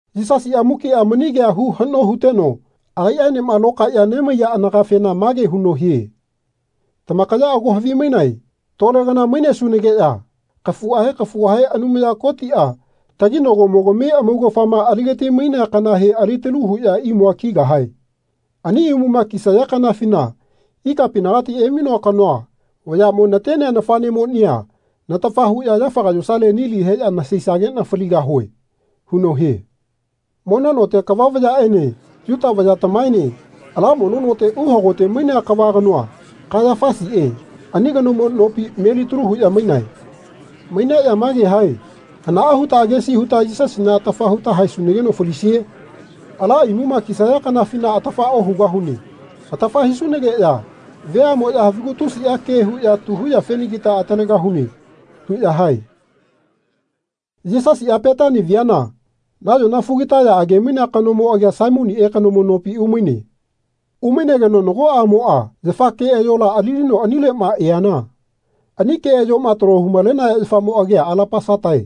Yisasiꞌa mukiꞌa mani kea hu haꞌno huteno agaiꞌaenema lokaeꞌya nemaiya anagafena mage huno hie “Tamakaya ago havimainae tole kana mainesunageꞌya kafuꞌahe kafuꞌahe Anumaya Kotiꞌa taginagomogami amaugafama ali-gati-mainea kanahe alitalu huꞌya imua kigahae. Ani imuma kisaya kanafina ikapinagati emainoa kanoa vayaꞌmo natenea nafaꞌnemoꞌnia natafa huꞌya yafaga yosale nili heꞌya nasasaigeꞌna faligahue.” huno hie. Mono note kava vayaꞌene Yuta vayatamaene ala mono note uhagote-mainea kava kanoa, Kaiyafasiꞌe ani kanomo nopi, melitalu huꞌya mainae. Maineꞌya mage hae “Hanaꞌa huta agesi huta Yisasina atafa huta haesunageno falisie? Ala imuma kisaya kanafina atafa ohugahune. Atafa hisunageꞌya veaꞌmoꞌya havigu tusiꞌa ke huꞌya tu huyafenagita atalegahune.” huꞌya hae. Yisasiꞌa Petani viana nayona fugitaya age-mainea kanomo agia Saimoniꞌe kanomo nopi umaine. Umainegeno nago aꞌmoꞌa yafa keꞌayola alilino anileꞌma eana ani keꞌayoꞌma taloma hu-malenaya yafamo agia alapasata.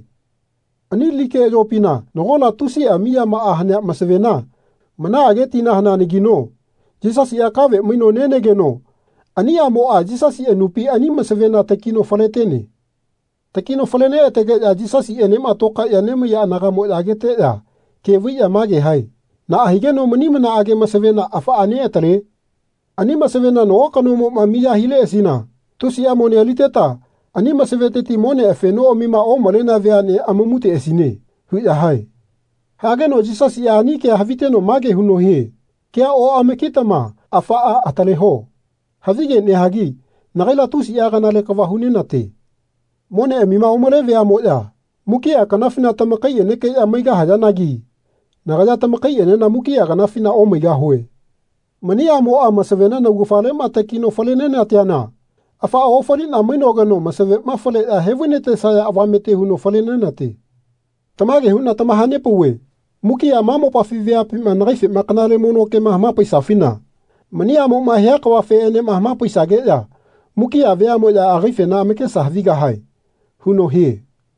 Ani li keꞌayopina nagola tusiꞌa miyamaꞌa hanea masavena manaꞌage tina haneanagino Yisasiꞌa kave maino nenegeno ani aꞌmoꞌa Yisasi anupi ani masavena takino fale-tene. Takino fale-neꞌa-tegeꞌya Yisasiꞌenema tokaeꞌya nemaiya anagaꞌmoꞌya ageteꞌya ke vaiꞌya mage hae “Naꞌa higeno mani manaꞌage masavena afaꞌa neꞌatale? Ani masavena nago kanomoꞌma miya hileꞌasina tusiꞌa mone aliteta ani masaveteti monea afenoꞌamima omalenea veaꞌne amamuteꞌasine.” huꞌya hae. Hageno Yisasiꞌa ani kea haviteno mage huno hie “Kea oꞌama-kitama afaꞌa ataleho. Havige nehagi nagaila tusiꞌa kanale kava hu-nena-te. Moneꞌamima omale veaꞌmoꞌya mukiꞌa kanafina tamakaiꞌenekeꞌya maigahayanagi nagaya tamaikaiꞌenena mukiꞌa kanafina omaigahue. Mani aꞌmoꞌa masavena naugafaleꞌma takino fale-nena-teana afaꞌa ofaliꞌna mainogeno masavema faleꞌya he-vai-na-tesaya avamete huno fale-nena-te. Tamage huꞌna tamaha-nepauve mukiꞌa ma mopafi veapima nagaifena kanale mono kema hama-paisafina mani aꞌmoꞌma hia kavafeꞌenema hama-paisageꞌya mukiꞌa veaꞌmoꞌya agaifena amakesa havigahae.” huno hie.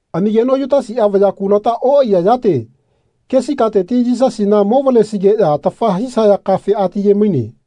Amigeno Yutasiꞌa vaya kulata oꞌaiya yate kesi kateti Yisasina movalesigeꞌya atafa hisaya kafe ati-ye-maine.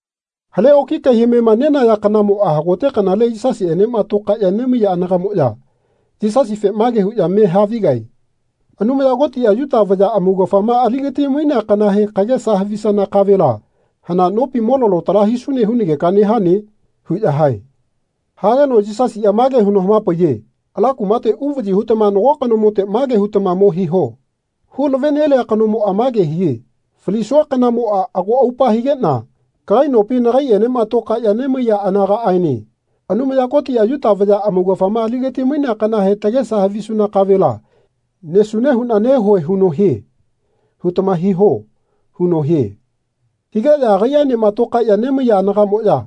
Hale oki kai-hamema nenaya kanamona hagote kanale Yisasiꞌenema tokaeꞌya nemaiya anagaꞌmoꞌya Yisasife mage huꞌya me havigae “Anumaya Kotiꞌa Yuta vaya amaugafama ali-ga-ti-mainea kanahe kagesa havisana kavela hana nopi mo-lalo tala hisune hunageka nehane?” huꞌya hae. Hageno Yisasiꞌa mage huno hama-paiye “Ala kumate uvaꞌyi hutama nago kanomote mage hutama mo hiho ‘Hu-lave-nelia kanomoꞌa mage hie ‘Falisua kanamoꞌa ago aupa higeꞌna kagai nopi nagaiꞌenema tokaeꞌya nemaiya anagaꞌaene Anumaya Kotiꞌa Yuta vaya amaugafama ali-ga-ti-mainea kanahe tagesa havisuna kavela nesune huꞌna nehueꞌ huno hie.’ hutama hiho.” huno hie. Higeꞌya agaiꞌaenema tokaeꞌya nemaiya anagaꞌmoꞌya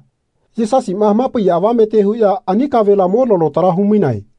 Yisasiꞌma hama-paiya avamete huꞌya ani kavela mo-lalo tala hu-mainae.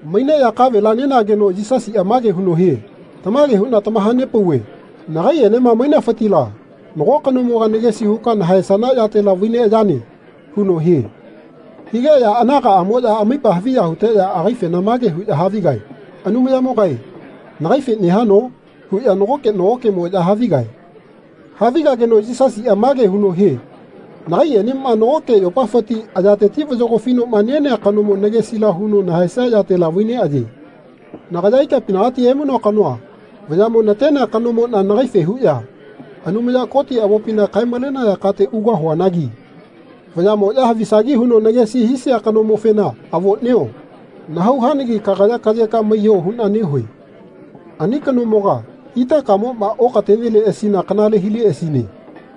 Maineꞌya kavela nenageno Yisasiꞌa mage huno hie “Tamage huꞌna tamaha-nepauve nagaiꞌenema mainafitila nago kanomoga nagesi huka nahaesana yatela vai-neꞌayane.” huno hie. Higeꞌya anagaꞌamoꞌya amaipa haviya huteꞌya agaifena mage huꞌya havigae “Anumayamogae nagaife nehano?” huꞌya nagoke nagokeꞌmoꞌya havigae. Havigageno Yisasiꞌa mage huno hie “Nagaiꞌenema nagoke yopafiti ayateti vayagofinoꞌma nenea kanomo nagesila huno nahaesia yatela vai-neꞌaye. Nagaya ikapinagati emainoa kanoa vayaꞌmo natenea kanomoꞌna nagaife huꞌya Anumaya Koti avopina kae-malenaya kate ugahuanagi vayaꞌmoꞌya havisagi huno nagesi hisia kanomofena avoꞌnio nahau hanagi kagaya kaꞌyeka maiyo huꞌna nehue. Ani kanomoga itakamoꞌma okateneleꞌasina kanale hileꞌasine.”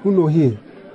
huno hie.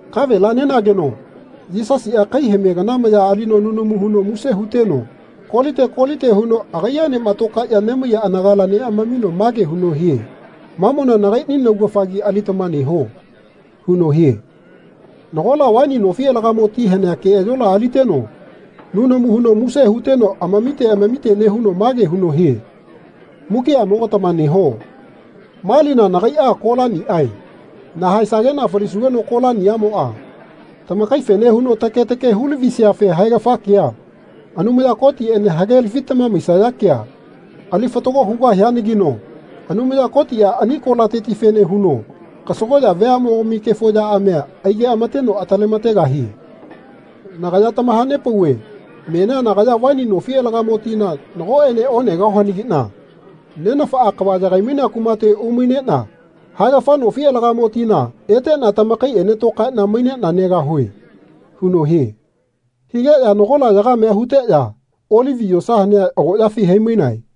Kavela nenageno Yisasiꞌa kai-hame kana maya alino nunamu huno muse huteno kolite kolite huno agaiꞌaenema tokaeꞌya nemaiya anagala neꞌamamino mage huno hie “Mamona nagaiꞌni naugafagi alitama neho.” huno hie. Nagola vaini nofi alagamo ti hanea keꞌayola aliteno nunamu huno muse huteno amamite amamite nehuno mage huno hie “Mukiꞌamogatama neho. Ma lina nagaiꞌa kolaniꞌae. Nahaesageꞌna falisugeno kolaniꞌamoꞌa tamakaifene huno take take hu-lavisiafe haegafa kea, Anumaya Kotiꞌene hagelafitama maisaya kea ali fatago hugahianagino Anumaya Kotiꞌa ani kolatetifene huno kasagoꞌya veaꞌmogami kefo yaꞌamia aige-ama-teno atale-ma-tegahie. Nagaya tamaha-nepauve menia nagaya vaini nofi alagamo tina nagoꞌene onegahuanagiꞌna Nenafaꞌa kava yagai-mainea kumate umaineꞌna haegafa nofi alagamo tina eteꞌna tamakaiꞌene tokaeꞌna maineꞌna negahue.” huno hie. Higeꞌya nagola yagamea huteꞌya Olivi yosa hanea agoꞌyafi hai-mainae.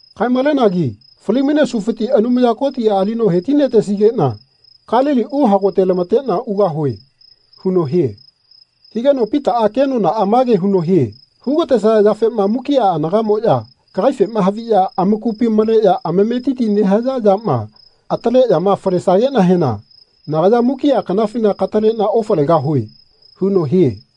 Kae-maleneanagi fali-mainesufiti Anumaya Kotiꞌa alino he-ti-na-tesigeꞌna Kalili uhagote-lama-teꞌna ugahue.” huno hie. Higeno Pitaꞌa kenonaꞌa mage huno hie “Hu-ga-tesaya yafema mukiꞌa anagaꞌmoꞌya kagaifema haviꞌya amakupi maleꞌya amametiti nehaya yama ataleꞌyama falesageꞌnahena nagaya mukiꞌa kanafina kataleꞌna ofalegahue.” huno hie.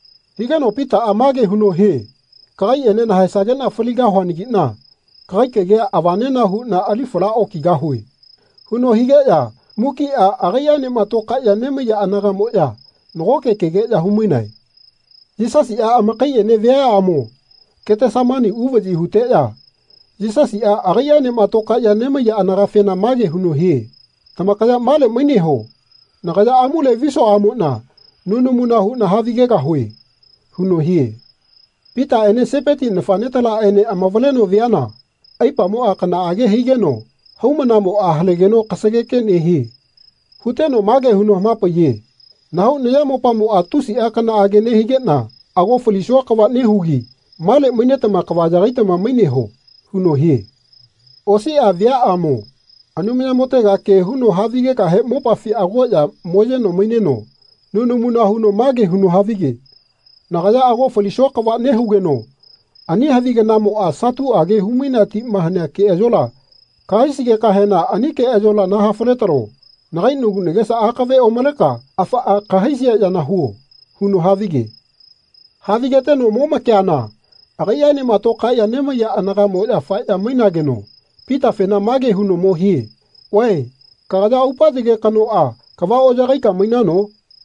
Higeno Pitaꞌa mage huno hie “Kagaiꞌene nahaesageꞌna faligahuanagiꞌna kagai kagia avanena huꞌna ali fala okigahue.” huno higeꞌya mukiꞌa agaiꞌaenema tokaeꞌya nemaiya anagaꞌmoꞌya nagoke kegeꞌya hu-mainae. Yisasiꞌa amakaiꞌene viaꞌamo Ketesemani uvaꞌyi huteꞌya Yisasiꞌa agaiꞌaenema tokaeꞌya nemaiya anagafena mage huno hie “Tamakaya male maineho. Nagaya amule visuaꞌamoꞌna nunamuna huꞌna havigegahue.” huno hie. Pitaꞌene Sepeti nafaꞌnetalaꞌene amavaleno viana aipamoꞌa kanaꞌage higeno haumanamoꞌa halegeno kasageke nehie. Huteno mage huno hama-paiye “Nahau nayamopamoꞌa tusiꞌa kanaꞌage nehigeꞌna ago falisua kava nehugi male mainetama kava yagaitama maineho.” huno hie. Osiꞌa viaꞌamo Anumayamotega ke huno havigegahe mopafi agoꞌya moyeno maineno nunamuna mage huno havige “Nagaya ago falisua kava nehugeno ani havi kanamoꞌa satuꞌage hu-mainea tima hanea keꞌayola kahaisigekahena ani keꞌayola naha-fale-talo. Nagai nagu nagesa akave omaleka afaꞌa kahaisia yana huo.” huno havige. Havigeteno momakeana agaiꞌaenema tokaeꞌya nemaiya anagaꞌmoꞌya faeꞌya mainageno Pitafena mage huno mo hie “Vae kagaya aupa yage kanoꞌa kava oꞌyagaika mainano?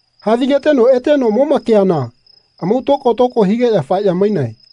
Havigeteno eteno momakeana amau tokotoko higeꞌya faeꞌya mainae.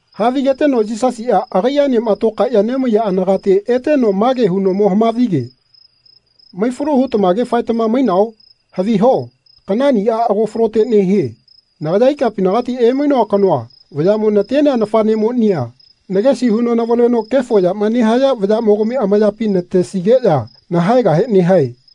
Havigeteno Yisasiꞌa agaiꞌaenema tokaeꞌya nemaiya anagate eteno mage huno mo hama-vige “Mai-falu hutamage faetama mainao? Haviho kanaꞌniꞌa ago falote nehie. Nagaya ikapinagati emainoa kanoa vayaꞌmo natenea nafaꞌnemonia nagesi huno navaleno kefo yama nehaya vayaꞌmogami amayapi natesigeꞌya nahaegahe nehae.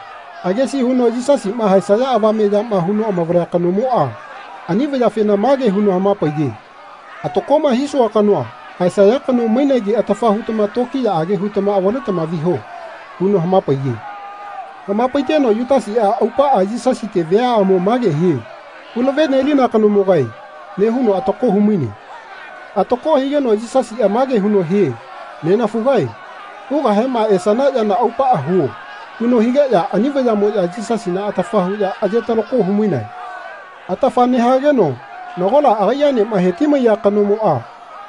Agesi huno Yisasima haesaya avame yama huno amavalea kanomoꞌa ani vayafena mage huno hama-paiye “Atakoꞌma hisua kanoa haesaya kano mainegi atafa hutama tokiyaꞌage hutama avaletama viho.” huno hama-paiye. Hama-paiteno Yutasiꞌa aupaꞌa Yisasite viaꞌamo mage hie “Hulave-nelina kanomogae.” nehuno atako hu-maine. Atako higeno Yisasiꞌa mage huno hie “Nenafugae hugahema esana yana aupaꞌa huo.” huno higeꞌya ani vayaꞌmoꞌya Yisasina atafa huꞌya aye-talako hu-mainae. Atafa nehageno nagola agaiꞌaenema he-ti-maiya kanomoꞌa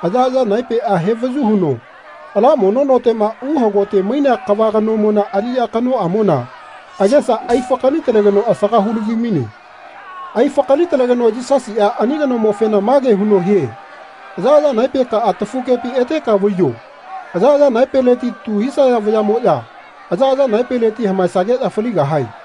ayaꞌaya naepeꞌa he-vayu huno ala mono noteꞌma uhagote mainea kava kanomona aliꞌya kanoꞌamona agesa ai-fakali-talegeno asaga hu-lavi-maine. Ai-fakali-talegeno Yisasiꞌa ani kanomofena mage huno hie “Ayaꞌaya naepekaꞌa tafugepi eteka vaiyo. Ayaꞌaya naepeleti tu hisaya vayaꞌmoꞌya ayaꞌaya naepeleti hamaesageꞌya faligahae.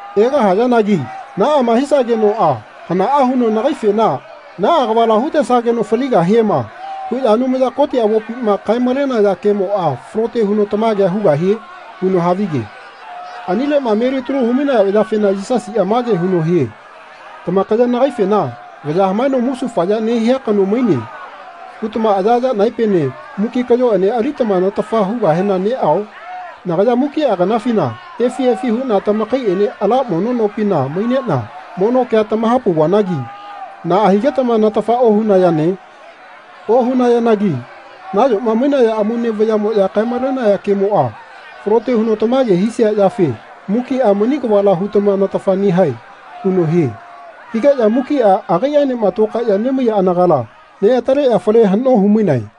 Egahayanagi naꞌama hisagenoꞌa hanaꞌa huno nagaifena ‘Naꞌa kavala hu-tesageno faligahiema.’ huꞌya Anumaya Koti avopima kae-malenaya kemoꞌa falote huno tamagea hugahie?” huno havige. Anileꞌma melitalu hu-maiya vayafena Yisasiꞌa mage huno hie “Tamakaya nagaifena ‘Vaya hamaeno musufaya nehia kano maine.’ hutama ayaꞌaya naepene muki kaꞌyoꞌene alitama natafa hugahena neꞌao? Nagaya mukiꞌa kanafina efi efi huꞌna tamakaiꞌene ala mono nopina maineꞌna mono kea tamaha-pauvanagi naꞌa higetama natafa ohunayane? Ohunayanagi nayoma mainaya amaune vayaꞌmoꞌya kae-malenaya kemoꞌa falote huno tamage hisia yafe mukiꞌa mani kavala hutama natafa nehae.” huno hie. Higeꞌya mukiꞌa agaiꞌaenema tokaeꞌya nemaiya anagala neꞌataleꞌya fale haꞌno hu-mainae.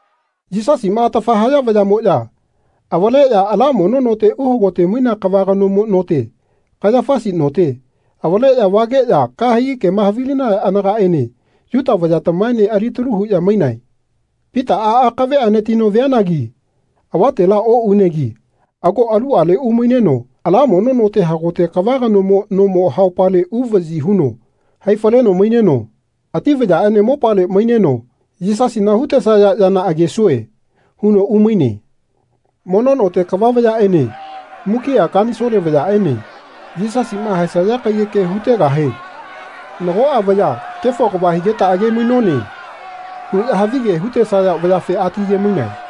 Yisasima atafa haya vayaꞌmoꞌya avaleꞌya ala mono note uhagote-mainea kava kanomo note, Kaiyafasi note, avaleꞌya vageꞌya kahegi kema havilinaya anagaꞌene Yuta vayatamaene alitalu huꞌya mainae. Pitaꞌa akave anatino vianagi avatela oꞌunegi ago aluꞌale umaineno ala mono note hagote kava kanomo nomo haupale uvaꞌyi huno hai-faleno maineno ati vayaꞌene mopale maineno “Yisasina hu-tesaya yana agesue.” huno umaine. Mono note kava vayaꞌene mukiꞌa kanisole vayaꞌene Yisasiꞌma haesaya kaiyeke hu-tegahe nagoꞌa vaya “Kefo kava higeta age-mainone.” huꞌya havige hu-tesaya vayafe ati-ye-mainae.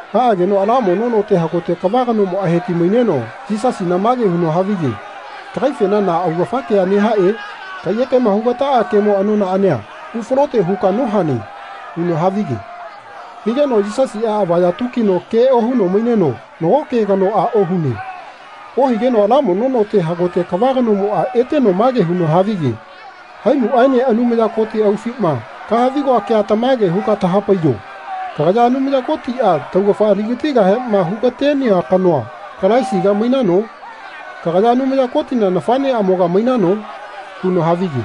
Haꞌageno ala mono note hagote kava kanomoꞌa heti-maineno Yisasina mage huno havige “Kagaifena na augafa kea nehae? Kaiyekema hu-ga-taꞌa kemo anonaꞌania hu-falote huka nohane?” huno havige. Higeno Yisasiꞌa avaya tukino ke ohuno maineno nago ke kanoꞌa ohune. Ohigeno ala mono note hagote kava kanomoꞌa eteno mage huno havige “Haimuꞌaene Anumaya Koti aufima kaha-vi-goa kea tamage huka taha-paiyo. Kagaya Anumaya Kotiꞌa taugafa ali-gatigahema hu-ga-tenea kanoa, Kalaisiga, mainano? Kagaya Anumaya Kotina nafaꞌneꞌamoga mainano?” huno havige.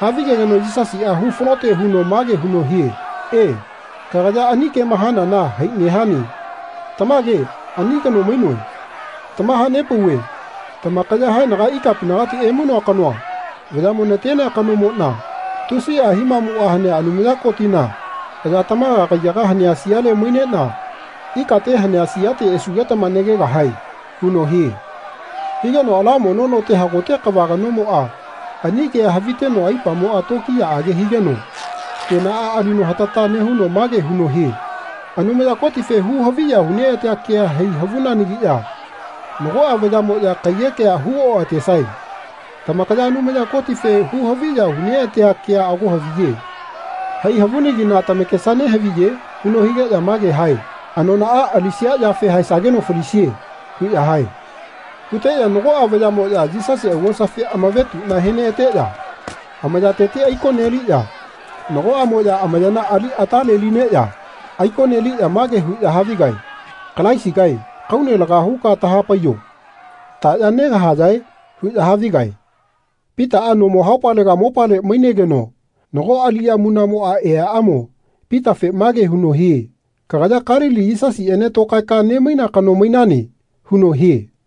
Havigegeno Yisasiꞌa hu-falote huno mage huno hie “E, kagaya ani kema hanana hai nehane. Tamage ani kano mainoe. Tamaha-nepauve tamakaya haenaga ikapinagati emainoa kanoa vayaꞌmo natenea kanomoꞌna tusiꞌa himamuꞌa hanea Anumaya Kotina aya tamaga kaiyaga hanea siale maineꞌna ikate hanea siate esugetama nagegahae.” huno hie. Higeno ala mono note hagote kava kanomoꞌa ani kea haviteno aipamoꞌa tokiyaꞌage higeno kenaꞌa alino hatata nehuno mage huno hie “Anumaya Kotife hu-haviya hu-neꞌatea kea hai havunanagiꞌya nagoꞌa vayaꞌmoꞌya kaiyekea hu-oꞌatesae. Tamakaya Anumaya Kotife hu-haviya hu-neꞌatea kea ago haviye. Hai havunagi na tamakesa nehaviye?” huno higeꞌya mage hae “Anonaꞌa alisia yafe haesageno falisie.” huꞌya hae. Huteꞌya nagoꞌa vayaꞌmoꞌya Yisasi augosafi amavetuꞌna he-neꞌateꞌya amayateti aiko-ligeꞌya nagoꞌamoꞌya amayana ali atale-lineꞌya aiko neliꞌya mage huꞌya havigae “Kalaisigae kaune laga huka taha-paiyo taꞌya negahayae?” huꞌya havigae. Pitaꞌa nomo haupalega mopale mainegeno nago aliꞌya munaꞌmoꞌa eaꞌamo Pitafe mage huno hie “Kagaya Kalili Yisasiꞌene tokaeka nemaina kano mainane.” huno hie.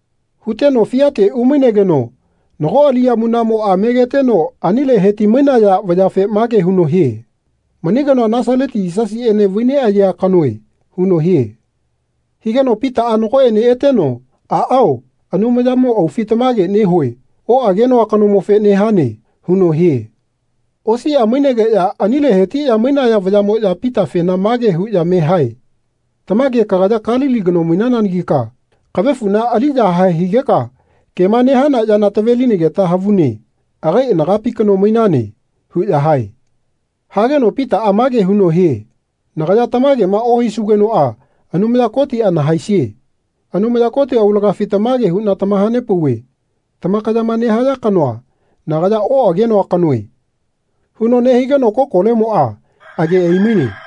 Huteno fiatega umainegeno nago aliꞌya munaꞌmoꞌa megeteno anile he-ti-mainaya vayafe mage huno hie “Mani kanoa Nasaleti Yisasiꞌene vai-neꞌayea kanoe.” huno hie. Higeno Pitaꞌa nagoꞌene eteno “Aꞌao Anumayamo aufi tamage nehue oꞌagenoa kanomofe nehane.” huno hie. Osiꞌa mainegeꞌya anile he-ti-maiya vayaꞌmoꞌya Pitafena mage huꞌya me hae “Tamage kagaya Kalili kano mainananagika kavefuꞌna ali-yahae higeka kema nehana yana tave-linageta havune agai anagapi kano mainane.” huꞌya hae. Hageno Pitaꞌa mage huno hie “Nagaya tamakema ohisugenoꞌa Anumaya Kotiꞌa nahaesie. Anumaya Koti aulagafi tamage huꞌna tamaha-nepauve tamakayama nehaya kanoa nagaya oꞌagenoa kanoe.” huno nehigeno kokolemoꞌa age ai-maine.